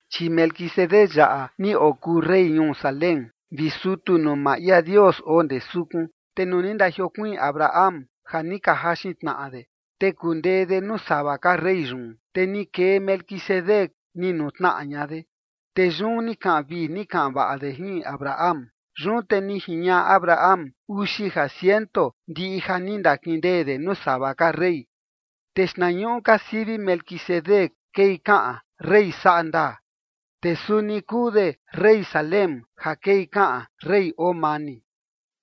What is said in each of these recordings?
Chi Melquisedec yaꞌa ni okuu rey ñuu Salem vi sutu nuu maa ia Dios oo ndee sukun. Te nuu ni ndajiokuiin Abraham ja ni ka jaxin tnaꞌa de, te kundee de nuu sava ka rey yun, te ni kee Melquisedec ni nutnaꞌa ña de, te yun ni kaꞌan vii ni kaꞌan vaꞌa de jin Abraham. Yun te ni jiñaꞌa Abraham uxi ja ciento ndiꞌi ja ni ndakindee de nuu sava ka rey. Te xtnañuꞌu ka sivi Melquisedec kei kaꞌan rey saꞌa ndaa; te suni kuu de rey Salem ja kei kaꞌan rey oo mani.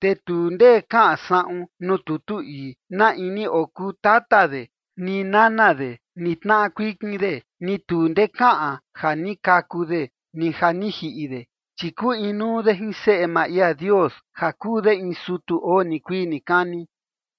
Te tu ndee kaꞌan saꞌun nuu tutu ii na in ni okuu tata de, ni nana de, ni tnaꞌa kuikin de, ni tu ndee kaꞌan ja ni kaku de ni ja ni jiꞌi de, chi kuu inuu de jin Seꞌe maa ia Dios ja kuu de in sutu oo nikuii nikani.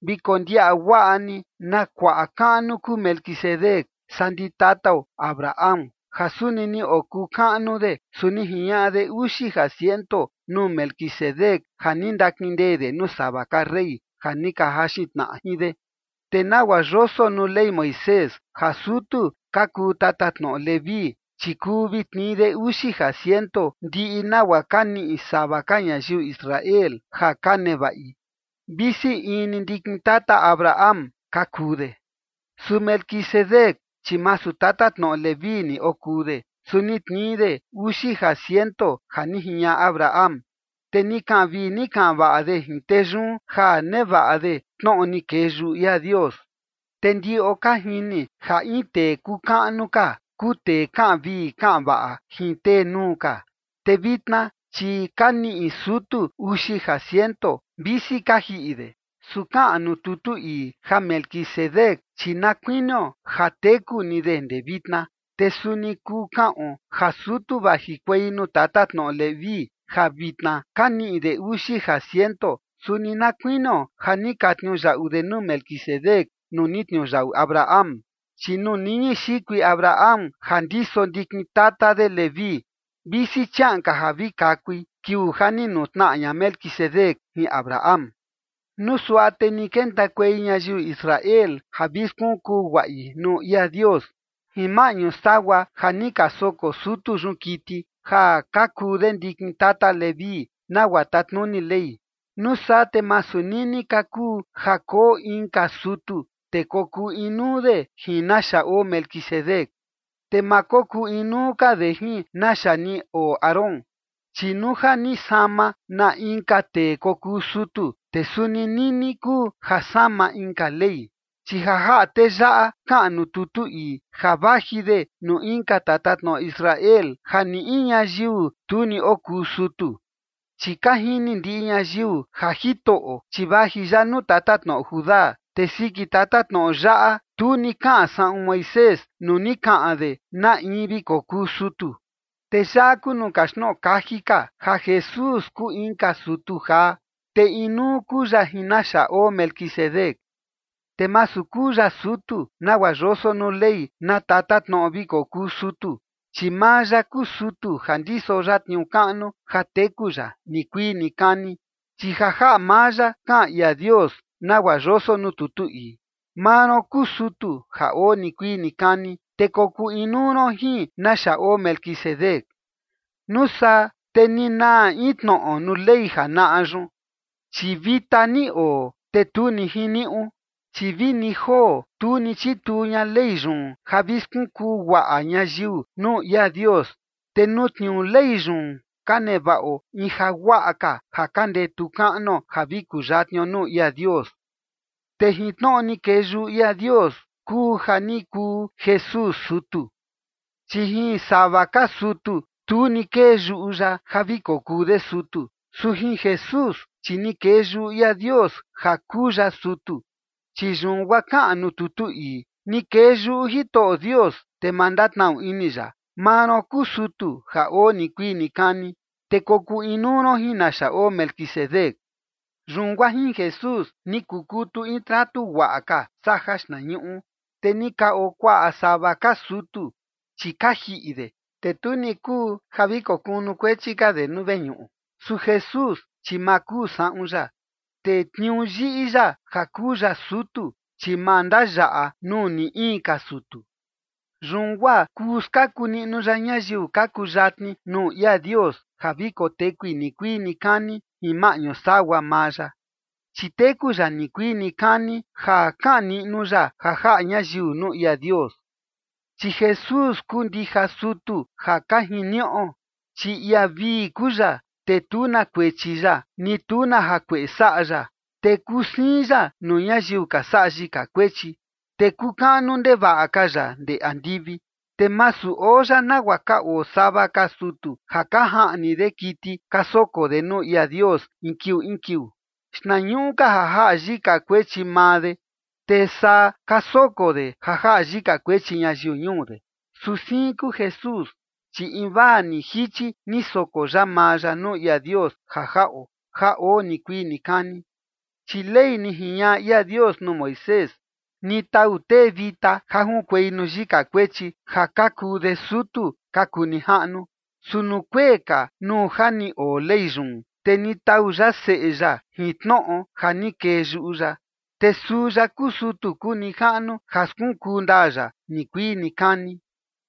Vi kondiaꞌa guaꞌa ni na kuaꞌa kaꞌnu kuu Melquisedec saa ndi tatao Abraham ja suni ni okuu kaꞌnu de, su ni jiñaꞌa de uxi ja ciento nuu Melquisedec ja ni ndakindee de nuu sava ka rey ja ni ka jaxin tnaꞌa jin de. Te nagua yoso nuu Ley Moisés ja sutu ka kuu tatatnoꞌo Leví, chi kuu vi tnii de uxi ja ciento ndiꞌi nagua ka niꞌi sava ka ñayiu Israel ja ka nevaꞌi, visi in ni ndikin tata Abraham ka kuu de. Su Melquisedec, chi masu tatatnoꞌo Leví ni okuu de, su ni tnii de uxi ja ciento ja ni jiñaꞌa Abraham, te ni kaꞌan vii ni kaꞌan vaꞌa de jin tee yun ja nevaꞌa de tnoꞌo ni kee yuꞌu ia Dios. Te ndiꞌo ka jini ja in tee kuu kaꞌnu ka kuu tee kaꞌan vii kaꞌan vaꞌa jin tee nuu ka. Te vitna, chi ka niꞌi sutu uxi ja ciento, visi ka jiꞌi de. Su kaꞌan nuu tutu ii ja Melquisedec, chi na kuinio ja teku ni de ndee vitna. Te suni kuu kaꞌon ja sutu vajikuei nuu tatatnoꞌo Leví ja vitna ka niꞌi de uxi ja ciento, suni na kuinio ja ni ka tniuyaꞌu de nuu Melquisedec nuu ni tniuyaꞌu Abraham. Chi nuu niñi xikui Abraham ja ndiso ndikin tata de Leví, visi chiaꞌan ka ja vi kakui, kiuu ja ni nutnaꞌa ña Melquisedec jin Abraham. Nuu suaꞌa te ni kentakuei ñayiu Israel ja vi skunkuu guaꞌi nuu ia Dios jin maꞌñu sagua ja ni ka soko sutu yun kiti, ja ka kuu de ndikin tata Leví nagua tatnuni Ley, nuu saa te masu nini ka kuu ja koo inka sutu, te kokuu inuu de jin naxa oo Melquisedec, te ma kokuu inuu ka de jin naxa ni oo Aarón. Chi nuu ja ni sama na inka tee kokuu sutu, te suni nini kuu ja sama inka ley. Chi ja jaꞌa tee yaꞌa kaꞌan nuu tutu ii ja vaji de nuu inka tatatnoꞌo Israel ja ni in ñayiu tu ni okuu sutu. Chi ka jini ndiꞌi ñayiu ja Jitoꞌo, chi vaji ya nuu tatatnoꞌo Judá, te siki tatatnoꞌo yaꞌa, tu ni kaꞌan saꞌun Moisés nuu ni kaꞌan de na in vi kokuu sutu. Te yaꞌa kuu nuu kaxtnoꞌo kaji ka, ja Jesús kuu inka sutu jaa, te inuu kuu ya jin naxa oo Melquisedec. Te masu kuu ya sutu nagua yoso nuu Ley na tatatnoꞌo vi kokuu sutu, chi maa ya kuu sutu ja ndiso ya tniuu kaꞌnu ja teku ya nikuii nikani. Chi ja jaꞌa maa ya kaꞌan ia Dios nagua yoso nuu tutu ii: Maa ron kuu sutu ja oo nikuii nikani, te kokuu inuu ron jin naxa oo Melquisedec. Nuu saa te ni naa in tnoꞌo nuu Ley janaꞌa yun, chi vita ni oo, te tu ni jiniuꞌu. Chi vini joo tu ni chituu ña Ley yun ja vi skunkuu guaꞌa ñayiu nuu ia Dios, te nuu tniuu Ley yun ka nevaꞌo in ja guaꞌa ka ja ka ndetu kaꞌnuo ja vi kuyatnio nuu ia Dios. Te jin tnoꞌo ni kee yuꞌu ia Dios kuu ja ni kuu Jesús sutu. Chi jin sava ka sutu tu ni kee yuꞌu ya ja vi kokuu de sutu, su jin Jesús, chi ni kee yuꞌu ia Dios ja kuu ya sutu, chi yun guaa kaꞌan nuu tutu ii: Ni kee yuꞌu Jitoꞌo Dios, te ma ndatnaꞌnu ini ya: “Maa ron kuu sutu ja oo nikuii nikani, te kokuu inuu ron jin naxa oo Melquisedec”. Yun guaa jin Jesús ni kukutu in tratu guaꞌa ka saa jaxtnañuꞌu. Te ni ka oo kuaꞌa sava ka sutu, chi ka jiꞌi de, te tu ni kuu ja vi kokunukuechi ka de nuu veñuꞌu. Su Jesús, chi ma kuu saꞌun ya, te tniuu yiꞌi ya ja kuu ya sutu, chi ma ndayaꞌa nuu ni in ka sutu. Yun guaa kuu skaku niꞌnu ya ñayiu ka kuyatni nuu ia Dios ja vi kotekui nikuii nikani jin maꞌñu sagua maa ya, chi teku ya nikuii nikani ja kaꞌan niꞌnu ya ja jaꞌa ñayiu nuu ia Dios. Chi Jesús kuu ndija sutu ja ka jiniuꞌo, chi ia vii kuu ya, te tu na kuechi ya, ni tu na jakueꞌe saꞌa ya, te kuu siin ya nuu ñayiu ka saꞌa yika kuechi, te kuu kaꞌnu ndevaꞌa ka ya ndee andivi. Te masu oo ya nagua ka oo sava ka sutu ja ka jaꞌni de kiti ka soko de nuu ia Dios in kiuu in kiuu, xtnañuꞌu ka ja jaꞌa yika kuechi maa de, te saa ka soko de ja jaꞌa yika kuechi ñayiu ñuu de. Su siin kuu Jesús, chi invaa ni jichi ni soko ya maa ya nuu ia Dios ja jaꞌo, ja oo nikuii nikani. Chi Ley ni jiñaꞌa ia Dios nuu Moisés, ni tau tee vita ja junkuei nuu yika kuechi ja ka kuu de sutu ka kuu nijaꞌnu. Su nuu kuee ka, nuu ja ni oo Ley yun, te ni tau ya Seꞌe ya jin tnoꞌo ja ni kee yuꞌu ya, te suu ya kuu sutu kuu nijaꞌnu ja skunkuu ndaa ya nikuii nikani.